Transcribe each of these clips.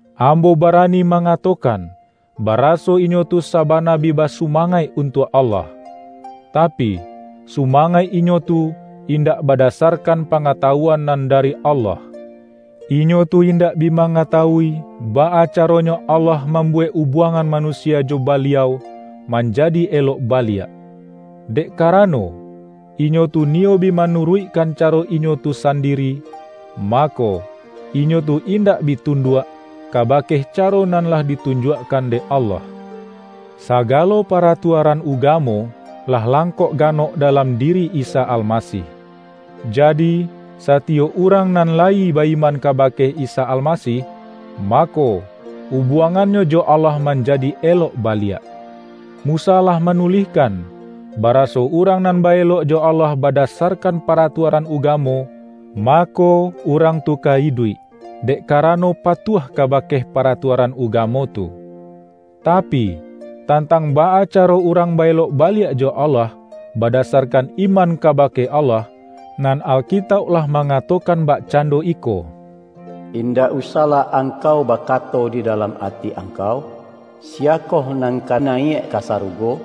Ambo barani mangatokan, baraso inyo tu sabana bi basumangaik untuak Allah. Tapi, sumangaik inyo tu, indak badasarkan pangatawuan nan dari Allah. Inyo tu indak bi mangatawui, baa caronyo Allah mambuwek ubuangan manusia jo Baliau, manjadi elok baliak. Dek karano, inyo tu niyo bi manuruikkan caro inyo tu sandiri, mako, inyo tu indak bi tunduak, kabake caro nan lah ditunjuakkan dek Allah. Sagalo paratuaran ugamo, lah langkok ganok dalam diri Isa Almasih. Jadi, satiyok urang nan layi ba-iman kabake Isa Almasih, mako, ubuangannyo jo Allah manjadi elok baliak. Musa lah manulihkan, baraso urang nan ba-elok jo Allah badasarkan paratuaran ugamo, mako, urang tu ka iduik, dek karano patuah kabake paratuaran ugamo tu. Tapi, tantang baa caro urang ba-elok baliak jo Allah, badasarkan iman kabake Allah, nan Alkitauk lah mangatokan bakcando iko,”Indak usahlah angkau bakato di dalam ati angkau, ’Siyakoh nan ka nayiak ka sarugo?'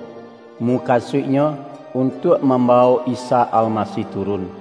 (mukasuiknyo, untuak mambawok Isa Almasih turun),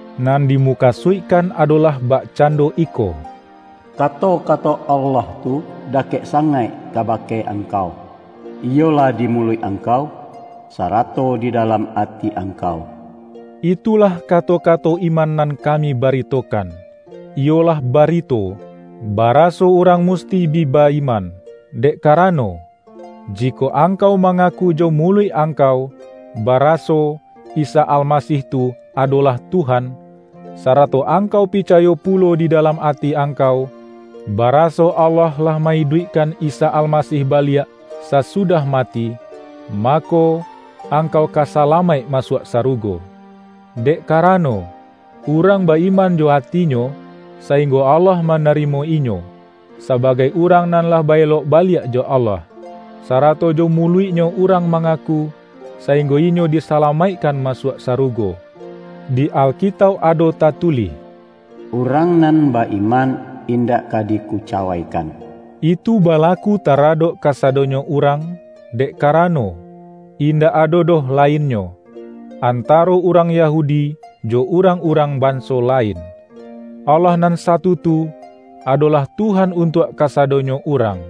Nan dimukasuikkan adolah bakcando iko,”Kato-kato Allah tu dakek sangaik kabake angkau; iyolah di muluik angkau, sarato di dalam ati angkau.” Itulah kato-kato iman nan kami baritokan; iyolah barito, baraso urang musti bi ba-iman. Dek karano, jikok angkau mangaku jo muluik angkau, baraso,”Isa Almasih tu, adolah Tuhan", sarato angkau picayo pulo di dalam ati angkau, baraso Allah lah ma-iduikkan Isa Almasih baliak, sasudah mati, mako, angkau ka salamaik masuak sarugo. Dek karano, urang ba-iman jo atinyo, sainggo Allah manarimo inyo, sabagai urang nan lah ba-elok baliak jo Allah. Sarato jo muluiknyo urang mangaku, sainggo inyo disalamaikkan masuak sarugo. Di Alkitauk ado tatulih,”Urang nan ba-iman indak ka dikucawaikan.” Itu balaku taradok kasadonyo urang, dek karano, indak ado doh lainnyo, antaro urang Yahudi jo urang-urang banso lain. Allah nan satu tu, adolah Tuhan untuak kasadonyo urang.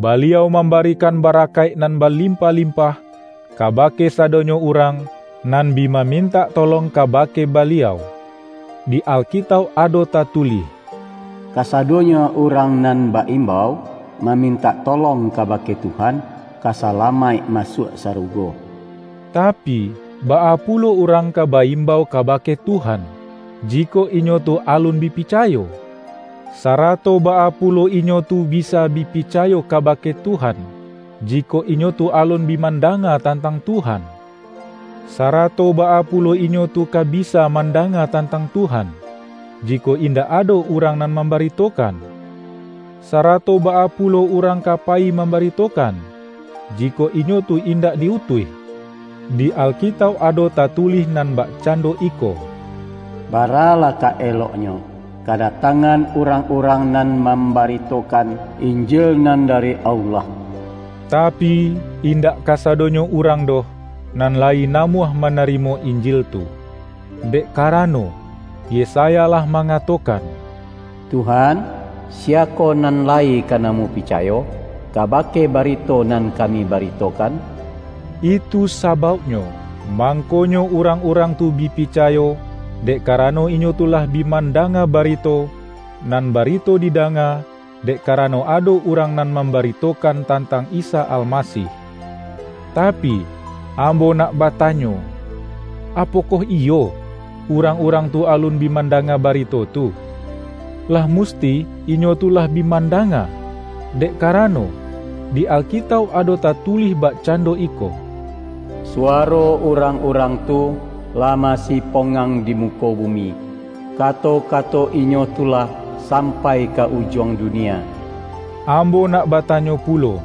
Baliau mambarikan barakaik nan balimpah-limpah, kabake sadonyo urang nan bi mamintak tolong kabake Baliau. Di Alkitauk ado tatulih,”Kasadonyo urang nan ba-imbau mamintak tolong kabake Tuhan, ka salamaik masuak sarugo.” Tapi, baa pulo urang ka ba-imbau kabake Tuhan, jikok inyo tu alun bi picayo? Sarato baa pulo inyo tu bisa bi picayo kabake Tuhan, jikok inyo tu alun bi mandanga tantang Tuhan? Sarato baa pulo inyo tu ka bisa mandanga tantang Tuhan, jikok indak ado urang nan mambaritokan? Sarato baa pulo urang ka payi mambaritokan, jikok inyo tu indak di-utuih? Di Alkitauk ado tatulih nan bakcando iko,”Baralah ka eloknyo, kadatangan urang-urang nan mambaritokan Injil nan dari Allah!” Tapi, indak kasadonyo urang doh, nan lai namuah manarimo Injil tu. Dek karano, Yesaya lah mangatokan,”Tuhan, siyakoh nan lai ka namuah picayo, kabake barito nan kami baritokan?” Itu sabauknyo, mangkonyo urang-urang tu bi picayo, dek karano inyo tu lah bi mandanga barito, nan barito didanga, dek karano ado urang nan mambaritokan tantang Isa Almasih. Tapi, ambo nak batanyo: Apokoh iyo, urang-urang tu alun bi mandanga barito tu? Lah musti, inyo tu lah bi mandanga! Dek karano, di Alkitauk ado tatulih bakcando iko,”Suwaro urang-urang tu, lah mansipongang di muko bumi, kato-kato inyo tu lah sampai ka ujuang dunia.” Ambo nak batanyo pulo: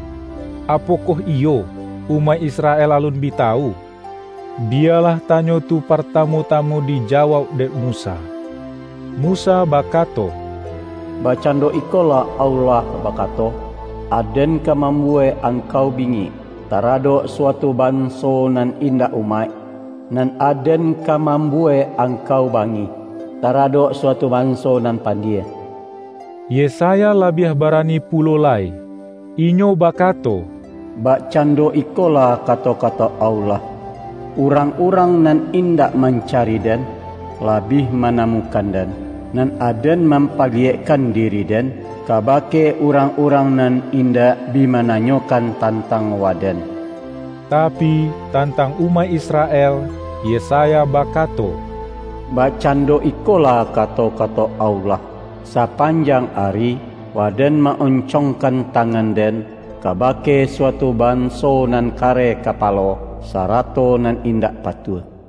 Apokoh iyo, umaik Israel alun bi tawu? Biyalah tanyo tu partamu-tamu dijawauk dek Musa. Musa bakato,”Bakcando ikolah Allah bakato, Aden ka mambuwek angkau bingik, taradok suatu banso nan indak umaik, nan Aden ka mambuwek angkau bangih, taradok suatu banso nan pandie.’” Yesaya labiah barani pulo lai. Inyo bakato,”Bakcando ikolah kato-kato Allah, ’Urang-urang nan indak mancari Den, lah bi manamukan Den; nan Aden mampaliyekkan diri-Den, kabake urang-urang nan indak bi mananyokan tantang Waden.’” Tapi, tantang umaik Israel, Yesaya bakato,”Bakcando ikolah kato-kato Allah, ’Sapanjang ari, Waden ma-oncongkan tangan-Den, kabake suatu banso nan kareh kapalo, sarato nan indak patuah.’” ROMA